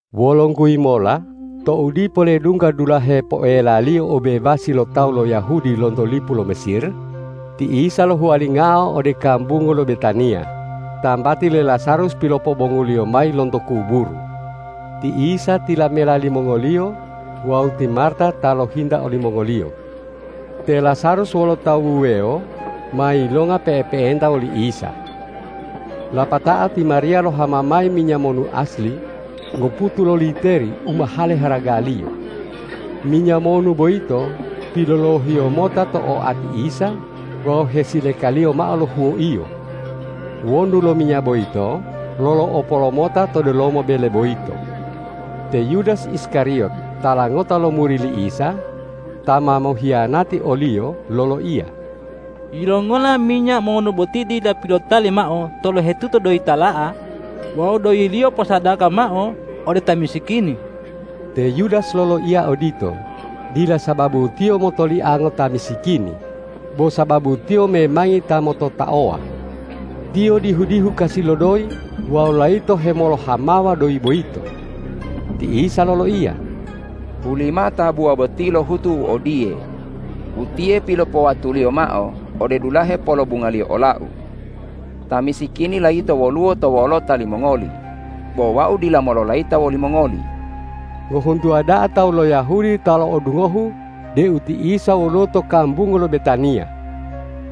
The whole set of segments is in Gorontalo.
Wolongguyi mola tou dipo ledungga dulahe poelaliyo obebasi lo tawu lo Yahudi lonto lipu lo Mesir, ti Isa lohuwalingao ode kambungu lo Betaniya, tambati le Lazarus pilopobongu-Liyo mayi lonto kuburu. Ti Isa tilamela limongoliyo wawu ti Marta ta lohinta olimongoliyo. Te Lazarus wolo tawu wuwewo ma yilonga pe'epe'enta woli Isa. Lapatao ti Mariya lohama mayi minya monu asli ngoputu loliteri u mahale haragaliyo. Minya monu boyito pilolohiyo mota to oati Isa wawu hesilekaliyo mao lo huwoiyo. Wonu lo minya boyito lolo'opo lomota to delomo bele boyito. Te Yudas Iskariyot tala ngota lo muri li Isa, ta ma mohiyanati o-Liyo loloiya, ”Yilongola minya monu boti dila pilotali mao tolohetuto doyi tala'a wawu doyiliyo posadaka mao ode ta misikini?” Te Yudas loloiya odito, dila sababu tiyo motoliango ta misikini, bo sababu tiyo memangi ta mototaowa. Tiyo dihu-dihu kasi lo doyi wawu layito hemolohamawa doyi boyito. Ti Isa loloiya,”Hulimao tabuwa boti lohutu u odiye, utiye pilopowatuliyo mao ode dulahe polobungaliyo ola-U. Ta misikini layito woluwo to wolota limongoli, bo Wau dila mololayita woli mongoli.” Ngohuntuwa da'a tawu lo Yahudi ta lo'odungohu deu ti Isa woluwo to kambungu lo Betaniya.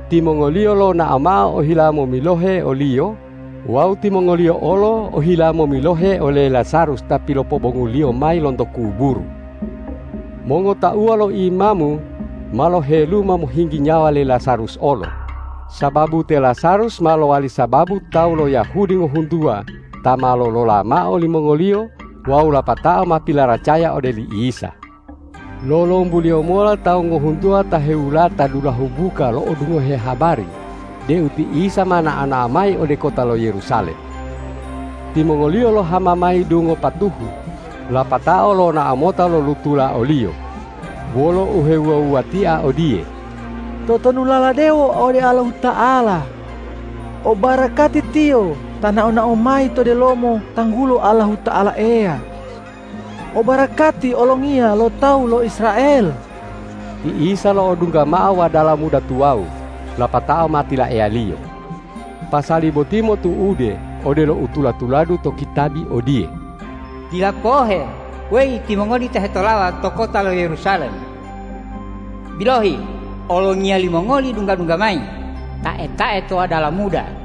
Timongoliyo lonao mao ohila momilohe o-Liyo wawu timongoliyo olo ohila momilohe ole Lazarus ta pilopobongu-Liyo mayi lonto kuburu. Mongotauwa lo imamu ma loheluma mohinggi nyawa le Lazarus olo, sababu te Lazarus ma lowali sababu tawu lo Yahudi ngohuntuwa ta ma lolola mao olimongoliyo wawu lapatao ma pilaracaya ode li Isa. Lolombuliyo mola tawu ngohuntuwa ta hewulata dulahu buka lo'odungohe habari deu ti Isa ma nao-nao mayi ode kota lo Yerusalem. Timongoliyo lohama mayi dungo patuhu lapatao lonao mota lolutula o-Liyo, wolo uhewuwa-wuwatia odiye,”Totonulala dewo ode Allahuta'ala! O barakati Tiyo ta nao-nao mayi to delomo tanggulo Allahuta'ala Eya! O barakati Olongiya lo tawu lo Israel!” Ti Isa lo'odungga mao wadala muda tuwawu lapatao ma tilaeya-Liyo. Pasali boti motu'ude odelo u tula-tuladu to kitabi odiye, ”Dila pohe, weyi timongoli ta hetolawa to kota lo Yerusalem! Bilohi, Olongiya limongoli dungga-dungga mayi, tae-tae to wadala muda!”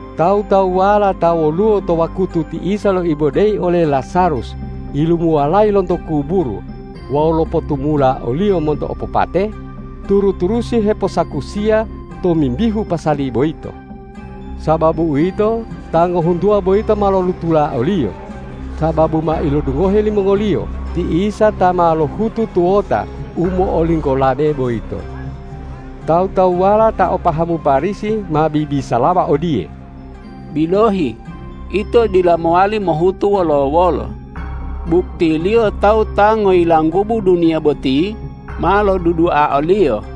Tawu-tawuwala ta woluwo to wakutu ti Isa loibodeyi ole Lazarus yilumuwalayi lonto kuburu wawu lopotumula oliyo monto opopate, turu-turusi heposakusiya tomimbihu pasali boyito. Sababu uwito, ta ngohuntuwa boyito ma lolutula o-Liyo, sababu ma ilodungohe limongoliyo ti Isa ta ma lohutu tuwota u mo'olinggolabe boyito. Tawu-tawuwala ta o pahamu Parisi ma bibisalawa odiye,”Bilohi, ito dila mowali mohutu wolo-wolo, buktiliyo tawu ta ngoyilanggubu duniya boti ma lodudua o-Liyo.”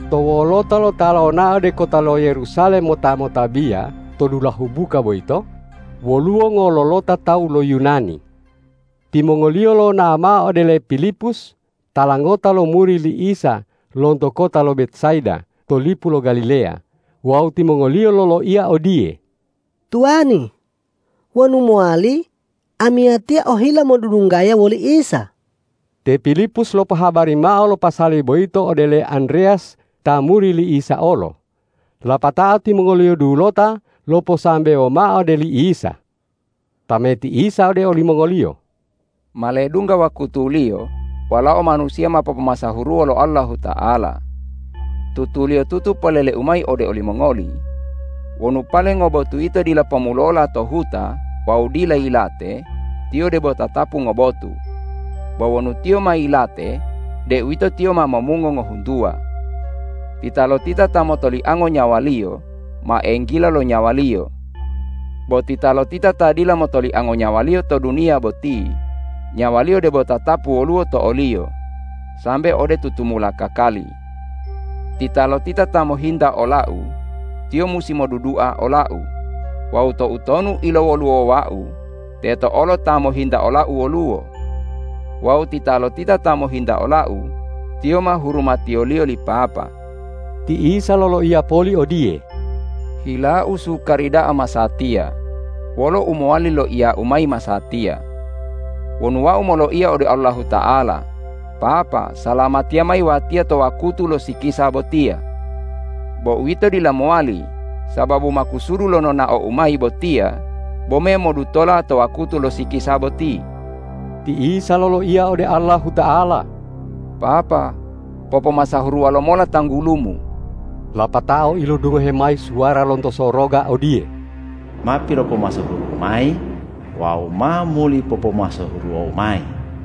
To wolota lo ta lonao ode kota lo Yerusalem mota motabiya to dulahu buka boyito, woluwo ngololota tawu lo Yunani. Timongoliyo lonao mao ode le Pilipus tala ngota lo muri li Isa lonto kota lo Betsaida to lipu lo Galileya wawu timongoliyo loloiya odiye,”Tuwani, wonu mowali, amiyatiya ohila modudunggaya woli Isa.” Te Pilipus lopohabari mao lo pasali boyito ode le Andreyas ta muri li Isa olo, lapatao timongoliyo dulota loposambewo mao ode li Isa. Tameti Isa ode olimongoliyo,”Ma ledungga wakutuliyo Walao Manusiya ma popomasahuruwo lo Allahuta'ala. Tutuliyotutu polele-U mayi ode olimongoli: Wonu pale ngobotu yito dila pomulola to huta wawu dila yilate, tiyo debo tatapu ngobotu. Bo wonu tiyo ma yilate, deuwito tiyo ma momungo ngohuntuwa. Titalotita ta motoliango nyawaliyo, ma enggila lo nyawaliyo. Bo titalotita ta dila motoliango nyawaliyo to duniya boti, nyawaliyo debo tatapu woluwo to oliyo sambe ode tutumula kakali. Titalotita ta mohinta ola-U, tiyo musi modudua ola-U; wawu toutonu ilowoluwowa-U teto olo ta mohinta ola-U woluwo. Wawu titalotita ta mohinta ola-U, tiyo ma hurumatiyoliyo li Papa.” Ti Isa loloiya poli odiye,”Hila-U sukari da'a masatiya; wolo u mowali loiya-U mayi masatiya? Wonu Wau moloiya ode Allahuta'ala, ’Papa, salamatiya mayi Watiya to wakutu lo sikisa botiya.’ Bo uwito dila mowali, sababu makusudu lo nonao-U mayi botiya bome modutola to wakutu lo sikisa boti.” Ti Isa loloiya ode Allahuta'ala,”Papa, popomasahuruwa lomola tanggulu-Mu!” Lapatao ilodungohe mayi suwara lonto soroga odiye,”Ma pilopomasahuru-U mayi wawu ma muli popomasahuruwo-U mayi!”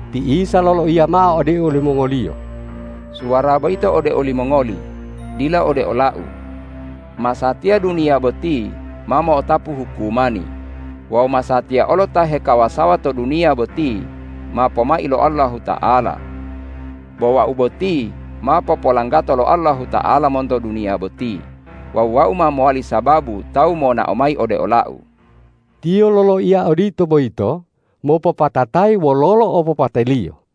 Ti Isa loloiya mao ode olimongoliyo,”Suwara boyito ode olimongoli, dila ode ola-U. Masatiya duniya boti ma mo'otapu hukumani wawu masatiya olo ta hekawasawa to duniya boti ma pomai lo Allahuta'ala. Bo Wau boti ma popolanggato lo Allahuta'ala monto duniya boti wawu Wau ma mowali sababu tawu monao mayi ode ola-U.” Tiyo loloiya odito boyito mopopatatayi wololo opopate-Liyo.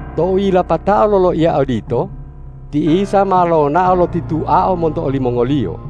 Tou yilapatao loloiya odito, ti Isa ma lonao lotituao monto olimongoliyo.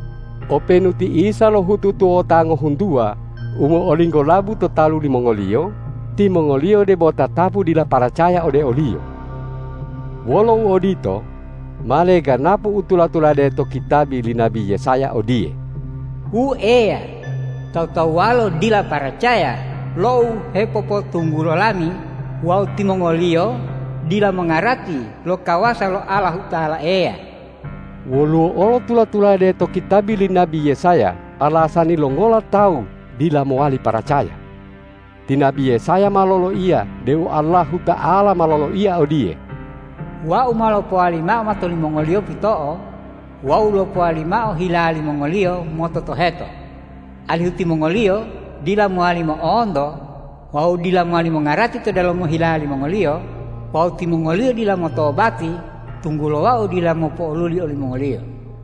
Openu ti Isa lohutu tuwota ngohuntuwa u mo'olinggolabu to talu limongoliyo, timongoliyo debo tatapu dila paracaya ode o-Liyo. Wolo uodito, ma leganapu u tula-tulade to kitabi li nabi Yesaya odiye,”Wu Eya, tawu-tawuwalo dila paracaya lo u hepopotunggulo lami wawu timongoliyo dila mongarati lo kawasa lo Allahuta'ala Eya.” Woluwo olo tula-tulade to kitabi li nabi Yesaya alasani longola tawu dila mowali paracaya. Ti nabi Yesaya ma loloiya deu Allahuta'ala ma loloiya odiye, ”Wau ma lopowali mao mato limongoliyo pito'o wawu lopowali mao hila limongoliyo mototoheto, alihu timongoliyo dila mowali mo'onto wawu dila mowali mongarati to delomo hila limongoliyo wawu timongoliyo dila motobati, tunggulo Wau dila mopo'oluli olimongoliyo.”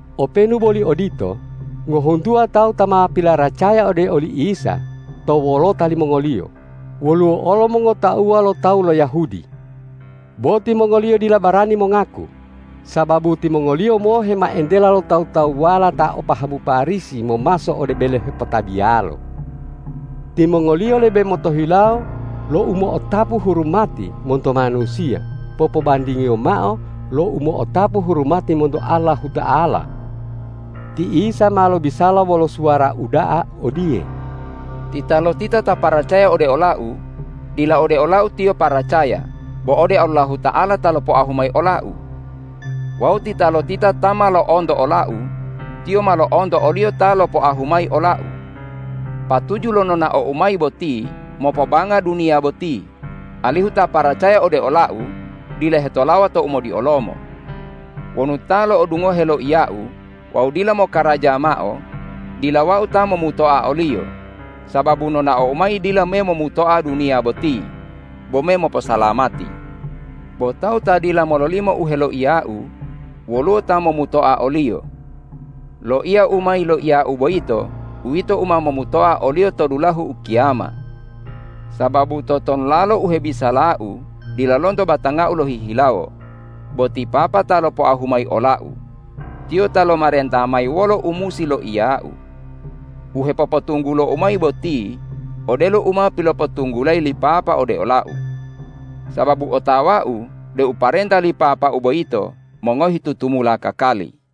Openu boli odito, ngohuntuwa tawu ta ma pilaracaya ode oli Isa to wolota limongoliyo woluwo olo mongotauwa lo tawu lo Yahudi. Bo timongoliyo dila barani mongaku, sababu timongoliyo mohe ma entela lo tawu-tawuwala ta o pahamu Parisi momaso ode bele hepotabiyalo. Timongoliyo lebe motohilawo lo umo'otapu hurumati monto manusiya popobandingiyo mao lo umo'otapu hurumati monto Allahuta'ala. Ti Isa ma lobisala wolo suwara uda'a odiye,”Titalotita ta paracaya ode ola-U, dila ode ola-U tiyo paracaya, bo ode Allahuta'ala ta lopoahu mayi ola-U. Wawu titalotita ta ma lo'onto ola-U, tiyo ma lo'onto o-Liyo ta lopoahu mayi ola-U. Patuju lo nonao-U mayi boti mopobanga duniya boti, alihu ta paracaya ode ola-U dila hetolawa to umodiolomo. Wonu ta lo'odungohe loiya-U wawu dila mokaraja mao, dila Wau ta momutoa oliyo, sababu nonao-U mayi dila me momutoa duniya boti, bome moposalamati. Bo tawu ta dila mololimo u heloiya-U, woluwo ta momutoa oliyo. Loiya u ma yiloiya-U boyito uwito u ma momutoa oliyo to dulahu ukiyama. Sababu totonulalo u hebisala-U dila lonto batanga-U lohihilawo, bo ti Papa ta lopoahu mayi ola-U, Tiyo ta lomarenta mayi wolo u musi loiya-U. U hepopotunggulo-U mayi boti, odelo u ma pilopotunggulayi li Papa ode ola-U. Sababu otawa-U deu parenta li Papa-U boyito mongohi tutumula kakali.”